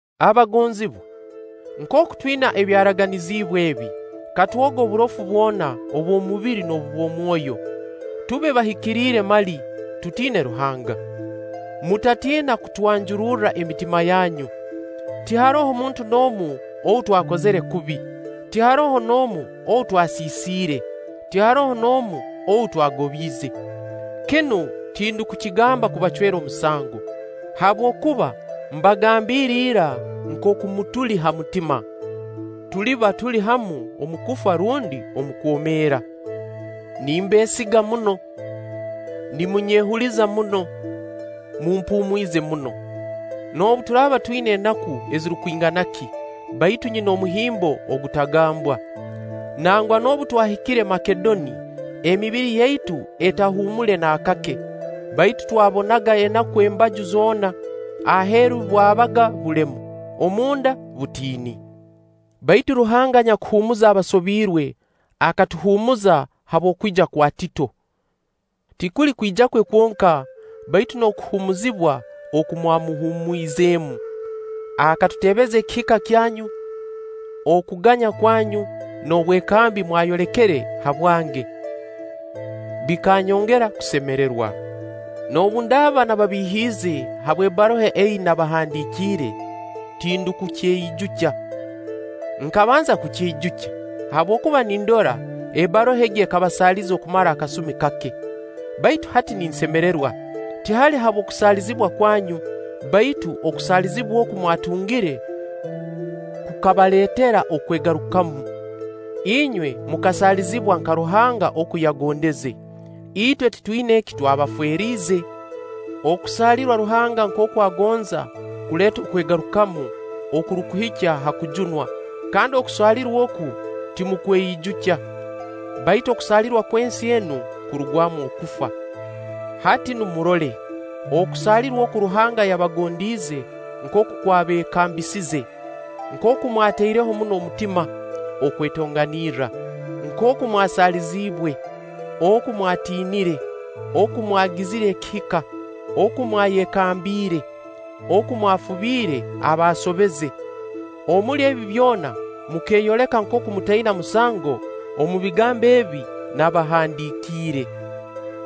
Abagonzibwa, nkooku twina ebyaraganiziibwe ebi, katwoge oburofu bwona obw'omubiri n'obw'omwoyo, tube bahikiriire mali, tutiine Ruhanga. Mutatiina kutwanjururra emitima yanyu. tiharoho muntu n'omu ou twakozire kubi, tiharoho n'omu ou twasiisire, tiharoho n'omu ou twagobiize. Kinu tindukukigamba kubacwera omusango, habwokuba mbagambiire ira nkooku mutuli ha mutima; tuliba tuli hamu omu kufa rundi omu kwomeera. Nimbeesiga muno; nimunyehuliza muno; mumpumwize muno. Noobu turaaba twina enaku ezirukwingana ki, baitu nyina omuhimbo ogutagambwa. Nangwa noobu twahikire Makedoni, emibiri yaitu etahuumule naakake, baitu twabonaga enaku embaju zoona-aheeru bwabaga bulemu, omu nda butiini. Baitu Ruhanga anyakuhuumuza abasobirwe, akatuhuumuza habw'okwija kwa Tito. Tikuli kwija kwe kwonka, baitu n'okuhuumuzibwa oku mwamuhuumwizemu. Akatutebeza ekihika kyanyu, okuganya kwanyu, n'obwekambi mwayolekere habwange. Bikanyongera kusemererwa. Noobu ndaaba nababihiize habw'ebbaruha ei nabahandiikiire, tindukukyeijukya. Nkabanza kukyeijukya, habwokuba nindora ebbaruha egi ekabasaaliza okumara akasumi kake. Baitu hati ninsemererwa, tihali habw'okusaalizibwa kwanyu, baitu okusaalizibwa oku mwatungire kukabaleetera okwegarukamu. Inywe mukasaalizibwa nka Ruhanga oku yagondeze; itwe titwina eki twabaferiize. Okusaalirwa Ruhanga nkooku agonza kuleeta okwegarukamu okurukuhikya ha kujunwa, kandi okusaalirwa oku timukweijukya; baitu okusaalirwa kw'ensi enu kurugwamu okufa. Hati nu murole okusaalirwa oku Ruhanga yabagondiize nkooku kwabeekambisiize: nkooku mwataireho muno omutima okwetonganirra, nkooku mwasaalirwe, oku mwatiinire, oku mwagizire ekihika, oku mwayekambiire, oku mwafubire abaasobeze! Omuli ebi byona mukeeyoleka nkooku mutaina musango omu bigambo ebi nabahandiikiire.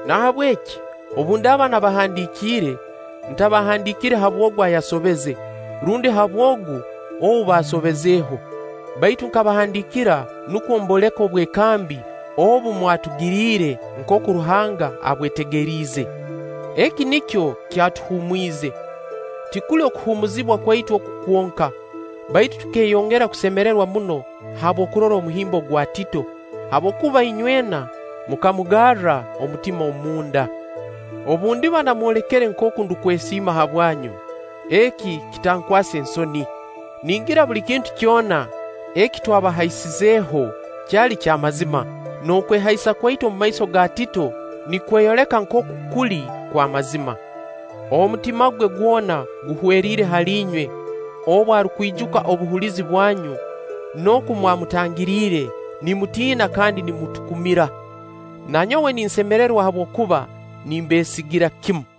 Nahabweki obu ndaaba nabahandiikiire, ntabahandiikire habw'ogu ayasobeze, rundi habw'ogu ou baasobezeho; baitu nkabahandiikira nukwo mbooleke obwekambi obu mwatugiriire nkooku Ruhanga abwetegeriize. Eki nikyo kyatuhuumwize. Tikuli okuhuumuzibwa kwaitu oku kwonka, baitu tukeeyongera kusemererwa muno habw'okurora omuhimbo gwa Tito, habwokuba inywena mukamugarra omutima omu nda. Obu ndiba nnamwolekere nkooku ndukwesiima habwanyu, eki kitankwase nsoni. Ningira buli kintu kyona eki twabahaisizeho kyali ky'amazima, n'okwehaisa kwaitu omu maiso ga Tito nikweyoleka nkooku kuli kw'amazima. Omutima gwe gwona guhweriire hali inywe obu arukwijuka obuhulizi bwanyu, n'oku mwamutangiriire nimutiina kandi numutukumira. Na nyowe ninsemererwa habwokuba nimbeesigira kimu.